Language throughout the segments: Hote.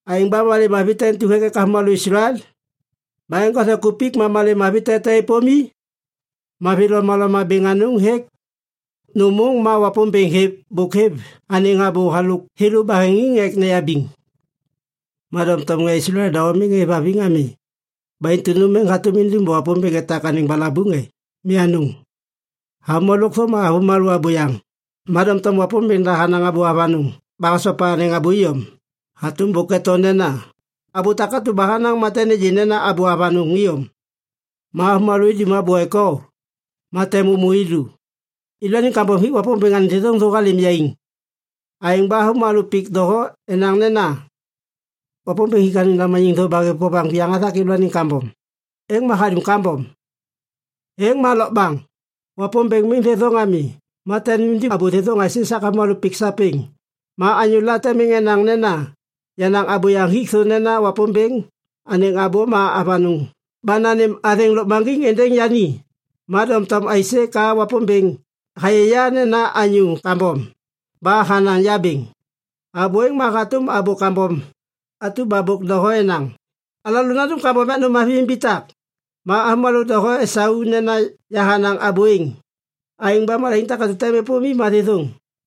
Aêŋ ba malê mavi te intu hêk ek avômalô Islael? Ma eŋgothe kupik, ma malê mavi te tem êpôm i? Mavi lomaloma bêŋ anôŋ hêk! Nôm môŋ ma Wapômbêŋ bôk hêv anêŋ abô halôk thêlô baheŋiŋ ek neyabiŋ. Ma doŋtom ŋê Islael doho miŋ êvhaviŋ ami. Ba intu nôm êŋ hatôm indum ba Wapômbêŋ etak anêŋ balabuŋ e? Mi anôŋ! Avômalô lôkthô ma avômalô abôyaŋ, ma doŋtom Wapômbêŋ da hanaŋ abô avanôŋ ba hasopa anêŋ abô iyom. Hatôm bôk eto nena, “Abô takatu ba honaŋ, ma tem nêgê nena abô avanôŋ iyom. Ma avômalô idum abô ek o, ma tem ômô i lu.” Yêlôaniŋ kambom hik Wapômbêŋ anêŋ thêthôŋ thô halêm yaiŋ. Aêŋ ba avômalô pik doho enaŋ nena, “Wapômbêŋ hik anêŋ lamaniŋ thô ba hêv vovaŋ viyaŋ hathak yêlôaniŋ kambom, êŋ ma hadum kambom.” Êŋ ma lokbaŋ! Wapômbêŋ miŋ thêthôŋ ami, ma tem indum abô thêthôŋ aisê esak avômalô pik sapêŋ? Ma anyôla tem enaŋ nena, “Yenaŋ abôyaŋ hik thô nena Wapômbêŋ anêŋ abô ma avanôŋ ba nanêm athêŋ lôkmaŋgiŋ êndêŋ yani. Ma doŋtom, aisê ka Wapômbêŋ hayê ya nena anyô kambom ba hanaŋ ya bêŋ?” Abô êŋ ma hatôm abô kambom atu ba bôk doho enaŋ, “Alalô nandum kambom ek nôm mavi imbitak.” Ma avômalô doho esau nena yahanaŋ abô êŋ. Aêŋ ba malaiŋ takatu ba tem êpôm i ma thêthôŋ.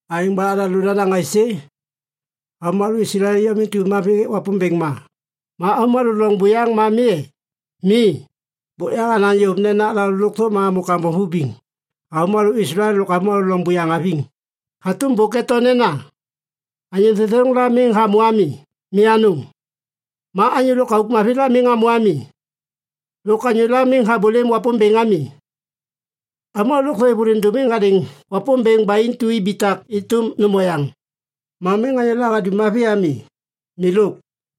Aêŋ ba alalô nanaŋ aisê? Avômalô Islael iyom intu mavi hêk Wapômbêŋ ma, ma avômalô loŋ buyaŋ ma mi e? Mi, bôk yahanaŋ yôv nena alalô lôkthô ma amô kambom vibiŋ, avômalô Islael lôk avômalô loŋ buyaŋ haviŋ. Hatôm bôk eto nena, “Anyô thêthôŋ la miŋ hamô ami. Mi anôŋ. Ma anyô lôkauk mavi la miŋ hamô ami. Lôk anyôla miŋ habôlêm Wapômbêŋ ami. Avômalô lôkthô êvôliŋ dômiŋiŋ hadêŋ Wapômbêŋ ba intu ibitak êtôm nôm oyaŋ. Ma miŋ anyôla hadum mavi ami, milôk.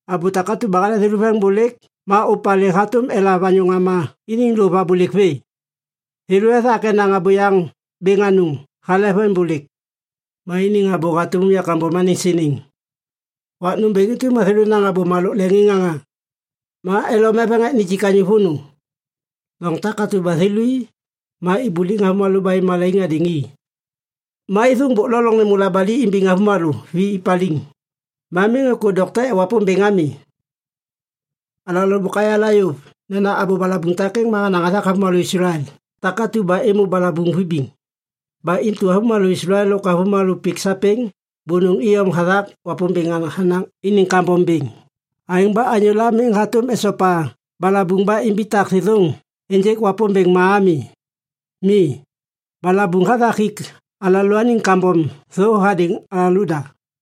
Abô takatu ba hale thêlô veŋiŋbôlêk ma ôvpalê hatôm elav anyô ŋama iniŋ lôv abôlêk vê. Thêlô ethak enaŋ abôyaŋ bêŋ anôŋ hale veŋiŋbôlêk. Ma iniŋ abô hatôm umya kambom anêŋ siniŋ. Wak nômbêŋ intu ma thêlô enaŋ abôma lôk leŋiŋŋaŋa. Ma elom eveŋ ek nijik anyô vônô. Loŋ takatu ba thêlô i, ma ibuliŋ avômalô ba êv malaiŋ hadêŋ i. Ma êthôŋ bôk lo loŋ nêmô labali imbiŋ avômalô vi paliŋ. Ma miŋ êkô dokte ek Wapômbêŋ ami.” Alalô bôk ayala yôv nena abô balabuŋ takêŋ ma hanaŋ hathak avômalô Islael takatu ba êmô balabuŋ vibiŋ. Ba intu avômalô Islael lôk avômalô pik sapêŋ bônôŋ iyom hathak Wapômbêŋ hanaŋ iniŋ kambom bêŋ. Aêŋ ba anyôla miŋ hatôm esopa balabuŋ ba imbitak thêthôŋ ênjêk Wapômbêŋ ma ami. Mi, balabuŋ hathak hik alalôaniŋ kambom thô hadêŋ alalôda.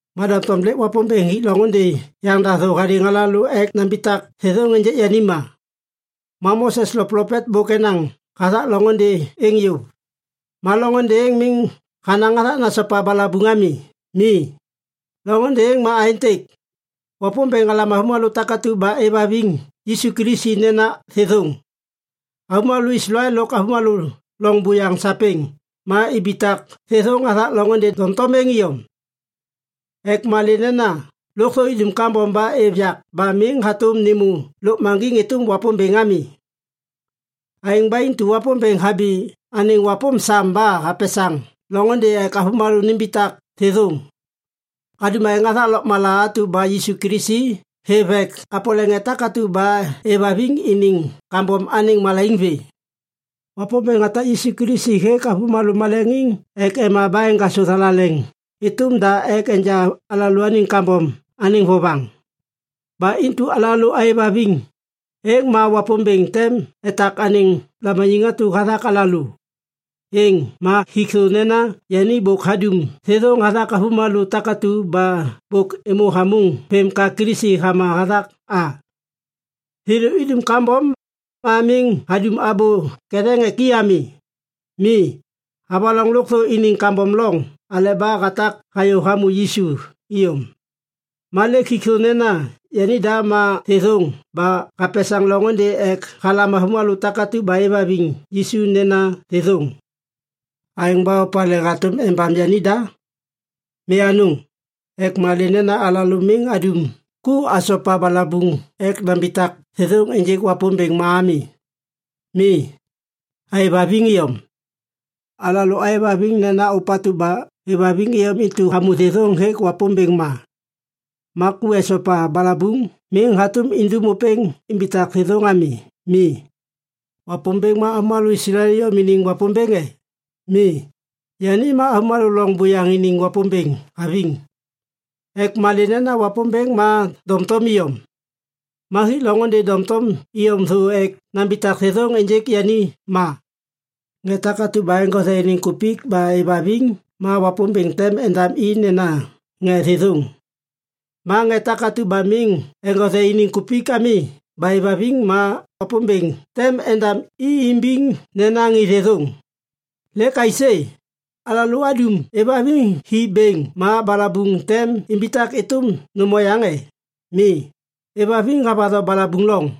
Ma doŋtom lêk Wapômbêŋ hik loŋôndê yaŋda thô hadêŋ alalô ek nambitak thêthôŋ ênjêk yani ma. Ma Mose lôk plopet bôk enaŋ hathak loŋôndê êŋ yôv. Ma loŋôndê êŋ miŋ hanaŋ hathak nesopa balabuŋ ami. Mi. Loŋôndê êŋ ma aêntêk. Wapômbêŋ halam avômalô takatu ba êvhaviŋ Yisu Kilisi nena thêthôŋ. Avômalô Islael lôk avômalô loŋ buyaŋ sapêŋ ma imbitak thêthôŋ hathak loŋôndê doŋtom êŋ iyom. Ek malê nena lôkthô idum kambom ba êv yak ba miŋ hatôm nêmô lôkmaŋgiŋ êtôm Wapômbêŋ ami. Aêŋ ba intu Wapômbêŋ habi anêŋ wapôm sam ba hapesaŋ loŋôndê ek avômalô nimbitak thêthôŋ. Hadum aêŋ hathak lôkmala atu ba Yisu Kilisi hêv ek hapole ŋê takatu ba êvhaviŋ iniŋ kambom anêŋ malaiŋ vê. Wapômbêŋ hatak Yisu Kilisi hêk avômalô maleŋiŋ ek ema ba eŋgasô anêŋ thalaleŋ êtôm da ek enja alalôaniŋ kambom anêŋ vovaŋ. Ba intu alalô aêvhaviŋ, êŋ ma Wapômbêŋ tem etak anêŋ lamaniŋ atu hathak alalô. Êŋ ma hik thô nena yani bôk hadum thêthôŋ hathak avômalô takatu ba bôk êmô hamôŋ vêm ka Kilisi hama hathak a. Thêlô idum kambom, ma miŋ hadum abô ketheŋ ek i ami. Mi, havaloŋ lôkthô iniŋ kambom loŋ aleba hatak hayô hamô Yisu iyom. Ma lêk hik thô nena yanida ma thêthôŋ ba hapesaŋ loŋôndê ek halam avômalô takatu ba êvhaviŋ Yisu nena thêthôŋ. Aêŋ ba opalê hatôm embam yanida? Mi anôŋ, ek malê nena alalô miŋ adum ku asopa balabuŋ ek nambitak thêthôŋ ênjêk Wapômbêŋ ma ami. Mi, aêvhaviŋ iyom. Alalô aêvhaviŋ nena ôpatu ba hêvhaviŋ iyom intu hamô thêthôŋ hêk Wapômbêŋ ma. Ma ku esopa balabuŋ miŋ hatôm indum ôpêŋ imbitak thêthôŋ ami. Mi. Wapômbêŋ ma avômalô Islael iyom iniŋ Wapômbêŋ e? Mi, yani ma avômalô loŋ buyaŋ iniŋ Wapômbêŋ haviŋ. Ek malê nena Wapômbêŋ ma doŋtom iyom. Ma hik loŋôndê doŋtom iyom thô ek nambitak thêthôŋ ênjêk yani ma. Ŋê takatu ba eŋgothe iniŋ kupik ba êvhaviŋ ma Wapômbêŋ tem endam i nena ŋê thêthôŋ. Ma ŋê takatu ba miŋ eŋgothe iniŋ kupik ami ba êvhaviŋ ma Wapômbêŋ tem endam i imbiŋ nena ŋê thêthôŋ. Lêk aisê? Alalô adum êvhaviŋ hi bêŋ ma balabuŋ tem imbitak êtôm nôm oyaŋ e? Mi, êvhaviŋ havatho balabuŋ loŋ.